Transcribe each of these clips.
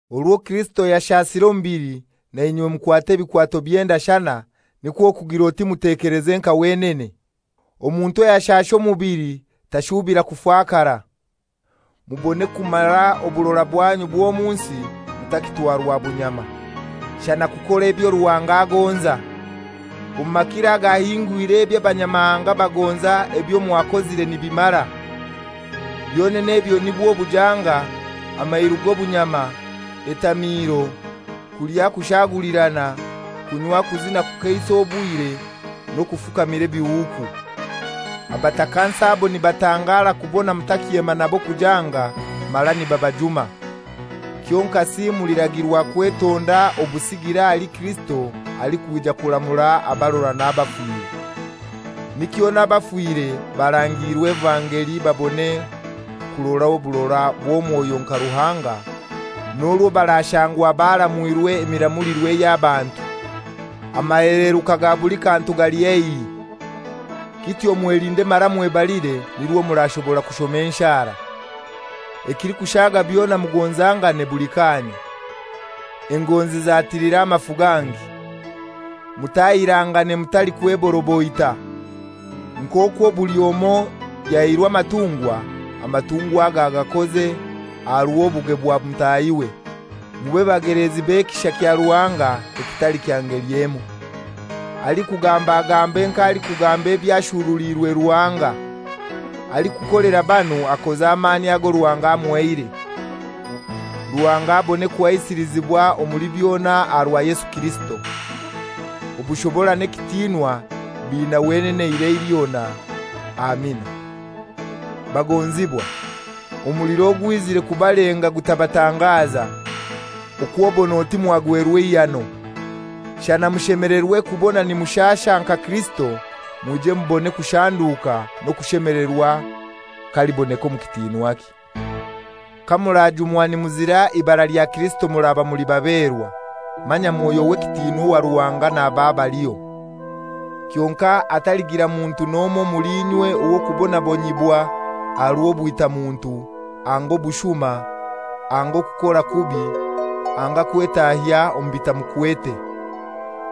Orwo Kirisito yashasire omubili, nainywe mukwate ebikwato by'endashana, nikwo kugir'oti mutekeleze nka wenene. Omuntu ayashasha omubili tashubira kufakara, mubone kumara oburora bwanyu bw'omu nsi mutakitwarwa bunyama, shana kukora ebyo Ruhanga agonza. Omu makiro agahingwire eby'abanyamahanga bagonza ebyo mwakozire nibimara. Byonene ebyo nibwo bujanga, amairu g'obunyama, etamiiro, kulya kushaagulirana, kunywa kuzina kukeisa obwire, n'okufukamira ebihuuku. Abatakansi abo nibatangara kubona mutakyema nabo kujanga, mara nibabajuma. Kyonkasi muliragirwa kwetonda obusigire ahali Kirisito alikwija kuramura abarora n'abafire. Nikyo n'abafire barangiirwe evangeli babone kurora oburora bw'omwoyo nka Ruhanga, n'orwo barashangwa baramwirwe emiramulirwe ey'abantu. Amaheleruka ga buli kantu gali haihi. Kityo mwelinde mara mwebalire nirwo murashobora kushoma enshara. Ekilikushaga byona mugonzangane buli kaanya; engonzi zatilira amafu gangi. Mutahirangane mutalikweboroboita. Nk'okwo buli omoi yahairwe amatungwa, amatungwa ago agakoze aha rw'obuge bwa mutahiwe, mube bageleezi b'ekisha kya Ruhanga ekitali kya ngeli emoi. Alikugamba agambe nk'alikugamba eby'ashuruliirwe Ruhanga. Alikukolera banu akoze amaani ago Ruhanga amuhaire. Ruhanga abone kuhaisilizibwa omuli byona aha rwa Yesu Kirisito. Obushobora n'ekitiinwa biina wenene eirai lyona. Amina. Bagonzibwa, omuliro ogwizire kubalenga gutabatangaza, okw'obon'oti mwagwerwa eihano. Shana mushemelerwe kubona nimushasha nka Kirisito, mwije mubone kushanduka n'okushemelerwa k'aliboneka omu kitinwakye. Kamurajumwa nimuzira eibara lya Kirisito muraba muli baberwa, manya Mwoyo w'ekitinwa owa Ruhanga naba abaliho. Kyonkai hataligira muntu n'omoi omuli inywe ow'okubonabonyibwa aha rw'obwita muntu, anga obushuma, anga okukora kubi, anga kwetahya omu bitamukwete.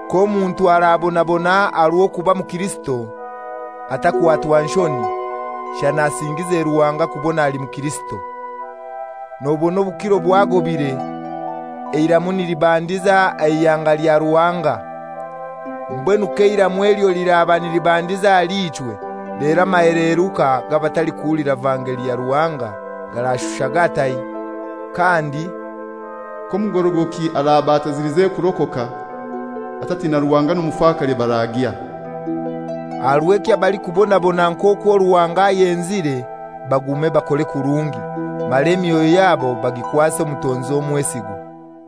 K'omuntu arabonabona aha rw'okuba mukirisito, atakwatwa nshoni, shana asingize Ruhanga kubona ali mukirisito. Nobona obukiro bwagobire, eiramu nilibandiza aha ihanga lya Ruhanga. Mbwenu k'eiramu elyo liraba nilibandiza ahali ichwe, lero amaheleruka g'abatahulira vangeli ya Ruhanga garashusha gatai? Kandi, «K'omugorogoki araba atazilize kurokoka, atatina Ruhanga n'omufakare baragyahai?» Aha rw'ekyo abalikubonabona nk'okwo Ruhanga ayenzire bagume bakore kurungi, mara emyoyo yabo bagikwase omutonzi omwesigwa.